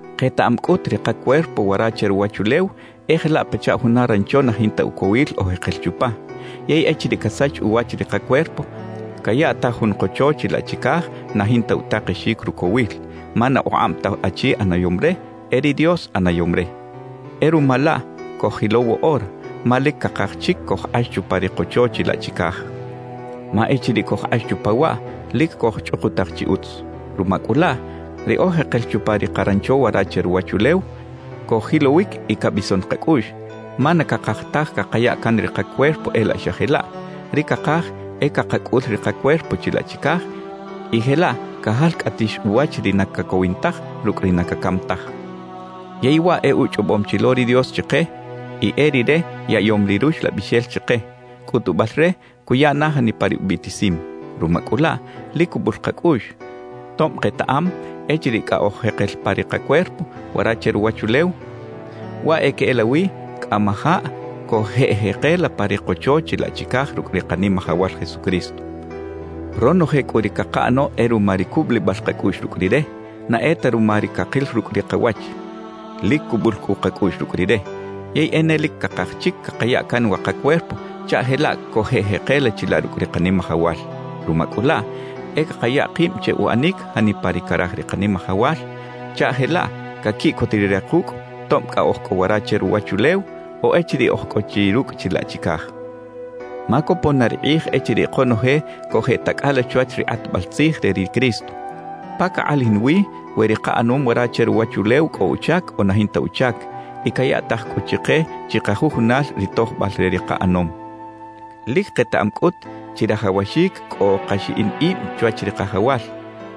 Ketaꞌam cꞌut ri kacuerpo wara che ruwachulew e jelaꞌ pachaꞌ juna rancho na jinta ucowil oj jekel chupa. Yey echiriꞌ casach uwach ri kacuerpo, cayaꞌtaj jun kocho chilaꞌ chicaj na jinta utakexic rucowil, ma na ukꞌab ta achi ꞌanayom re, e ri Dios ꞌanayom re. Y ruma laꞌ coj-jilow woꞌora, ma lic cakaj chic cojkꞌax chupa ri kocho chilaꞌ chicaj. Ma echiriꞌ cojkꞌax chupa waꞌ, lic cojchꞌukutaj chi utz. Ruma cꞌu laꞌ, ri oj jekel chupa ri “karancho” wara che ruwachulew, coj-jilowic y cabison kacꞌuꞌx; ma na cakaj taj cakaya can ri kacuerpo e laꞌ xa jelaꞌ; ri cakaj e cakacꞌul ri kacuerpo chilaꞌ chicaj y jelaꞌ cajalcꞌatix uwach ri na cacowin taj rucꞌ ri na cacam taj. Yey waꞌ e uchꞌobom chi lo ri Dios chike; y e Rire yaꞌyom ri Ruxlabixel chike, cꞌutubal re cuya na janipa ri ubiꞌtisim. Ruma cꞌu laꞌ, lic cubul kacꞌuꞌx, tob ketaꞌam echiriꞌ cꞌa oj jekel pa ri kacuerpo wara che ruwachulew, waꞌ e queꞌelawi cꞌamajaꞌ cojeꞌjekela pa ri kocho chilaꞌ chicaj rucꞌ ri Kanimajawal Jesucristo. Ronoje cꞌu ri cakaꞌano e ruma ri cubulibal kacꞌuꞌx rucꞌ Rire, na e ta ruma ri cakil rucꞌ ri kawach. Lic cubul cꞌu kacꞌuꞌx rucꞌ Rire. Yey e ne lic cakaj chic cakaya can wa kacuerpo chaꞌ jelaꞌ cojeꞌjekela chilaꞌ rucꞌ ri Kanimajawal. Ruma cꞌu laꞌ, e cakaya kib che uꞌanic janipa ri caraj ri Kanimajawal, chaꞌ jelaꞌ caquiꞌcot Rire kucꞌ tob cꞌa oj cꞌo wara che ruwachulew o echiriꞌ oj cꞌo chi rucꞌ chilaꞌ chicaj. Ma copon na ri kꞌij echiriꞌ konoje cojeꞌtacꞌala chwach ri kꞌatbal tzij re ri Cristo, pa cakꞌalajin wi we ri kaꞌanom wara che ruwachulew cꞌo uchac o na jinta uchac, y cayaꞌtaj cꞌu chike chikajujunal ri tojbal re ri kaꞌanom. Lic ketaꞌam cꞌut, chirajawaxic cꞌo kaxiꞌin ib chwach ri Kajawal;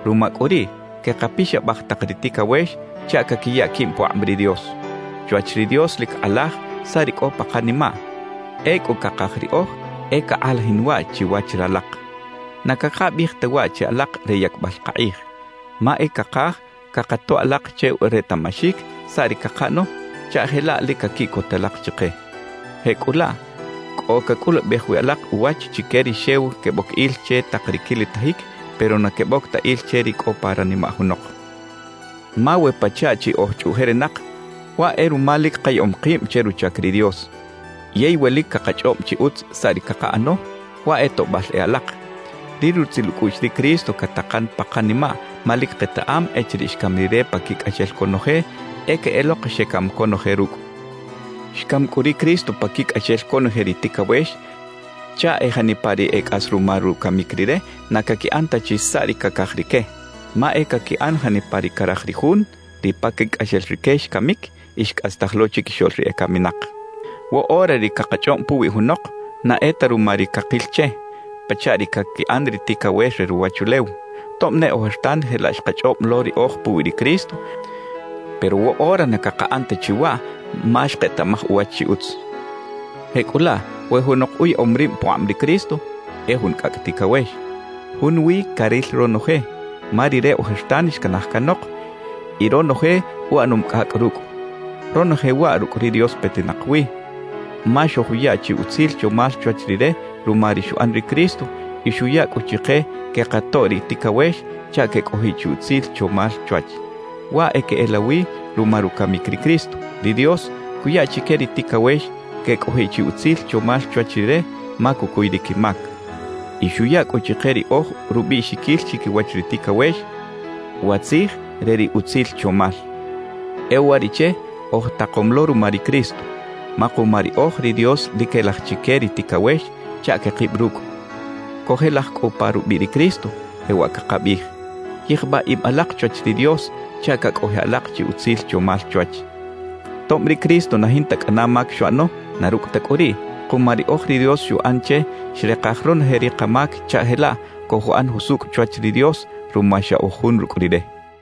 ruma cꞌu riꞌ, quekapixabaj tak ri ticawex chaꞌ caquiya quib pukꞌab ri Dios. Chwach ri Dios lic kꞌalaj saꞌ ri cꞌo pa kanimaꞌ; ecꞌu cakaj riꞌoj e cakꞌalajin waꞌ chiwach ralak. Na cakabiꞌij ta waꞌ che alak re yacbal kakꞌij. Ma e cakaj cakatoꞌ alak che retaꞌmaxic saꞌ ri cakaꞌano chaꞌ jelaꞌ lic caquiꞌcot alak chike. Jecꞌulaꞌ cꞌo cacꞌulubej wi alak uwach chique ri xew queboc il che tak ri quilitajic pero na queboc ta il che ri cꞌo pa ranimaꞌ junok. Ma we pachaꞌ chi oj chꞌuꞌjerinak, waꞌ e ruma lic kayaꞌom kib che ruchac ri Dios. Yey we lic cakachꞌob chi utz saꞌ ri cakaꞌano, waꞌ e toꞌbal e alak. Ri rutzil ucꞌuꞌx ri Cristo catakan pa kanimaꞌ ma lic ketaꞌam echiriꞌ xcam Rire paquicꞌaxel conoje, e queꞌelok xecam conoje rucꞌ. Xcam cꞌu ri Cristo paquicꞌaxel conoje ri ticawex chaꞌ e janipa ri e cꞌas ruma rucamic Rire na caquiꞌan ta chi saꞌ ri cacaj rique, ma e caquiꞌan janipa ri caraj ri Jun ri paquicꞌaxel rique xcamic y xcꞌastaj lo chiquixoꞌl ri ecaminak. Woꞌora ri cakachꞌob puwi junok, na e ta ruma ri cakil che, pachaꞌ ri caquiꞌan ri ticawex re ruwachulew. Tob ne ojertan jelaꞌ xkachꞌob lo riꞌoj puwi ri Cristo, pero woꞌora na cakaꞌan ta chi waꞌ ma xketaꞌmaj uwach chi utz. Jecꞌulaꞌ we junok uyaꞌom rib pukꞌab ri Cristo, e jun cꞌacꞌ ticawex. Junwi caril ronoje, ma ri re ojertan xcanaj canok y ronoje uꞌanom cꞌacꞌ rucꞌ. Ronoje waꞌ rucꞌ ri Dios petinak wi, ma xojuya chi utzil chomal chwach Rire ruma ri xuꞌan ri Cristo y xuya cꞌu chike quekatoꞌ ri ticawex chaꞌ quecꞌojiꞌ chi utzil chomal chwach. Waꞌ e queꞌelawi ruma rucamic ri Cristo, ri Dios cuya chique ri ticawex quecꞌojiꞌ chi utzil chomal chwach Rire ma cucuy ri quimac. Y xuya cꞌu chike riꞌoj rubiꞌxiquil chiquiwach ri ticawex wa tzij re ri utzil chomal. E uwariꞌche oj takom lo ruma ri Cristo. Ma kuma riꞌoj ri Dios lic quelaj chique ri ticawex chaꞌ quekib rucꞌ. Cojelaj cꞌu pa rubiꞌ ri Cristo, jewaꞌ cakabiꞌij: «Yijbaꞌ ib alak chwach ri Dios chaꞌ cacꞌojiꞌ alak chi utzil chomal chwach.» Tob ri Cristo na jinta cꞌana mac xuꞌano, na rucꞌ ta cꞌu riꞌ, kuma riꞌoj ri Dios xuꞌan che xrekaj ronoje ri kamac chaꞌ jelaꞌ cojuꞌan jusucꞌ chwach ri Dios ruma xa oj jun rucꞌ Rire.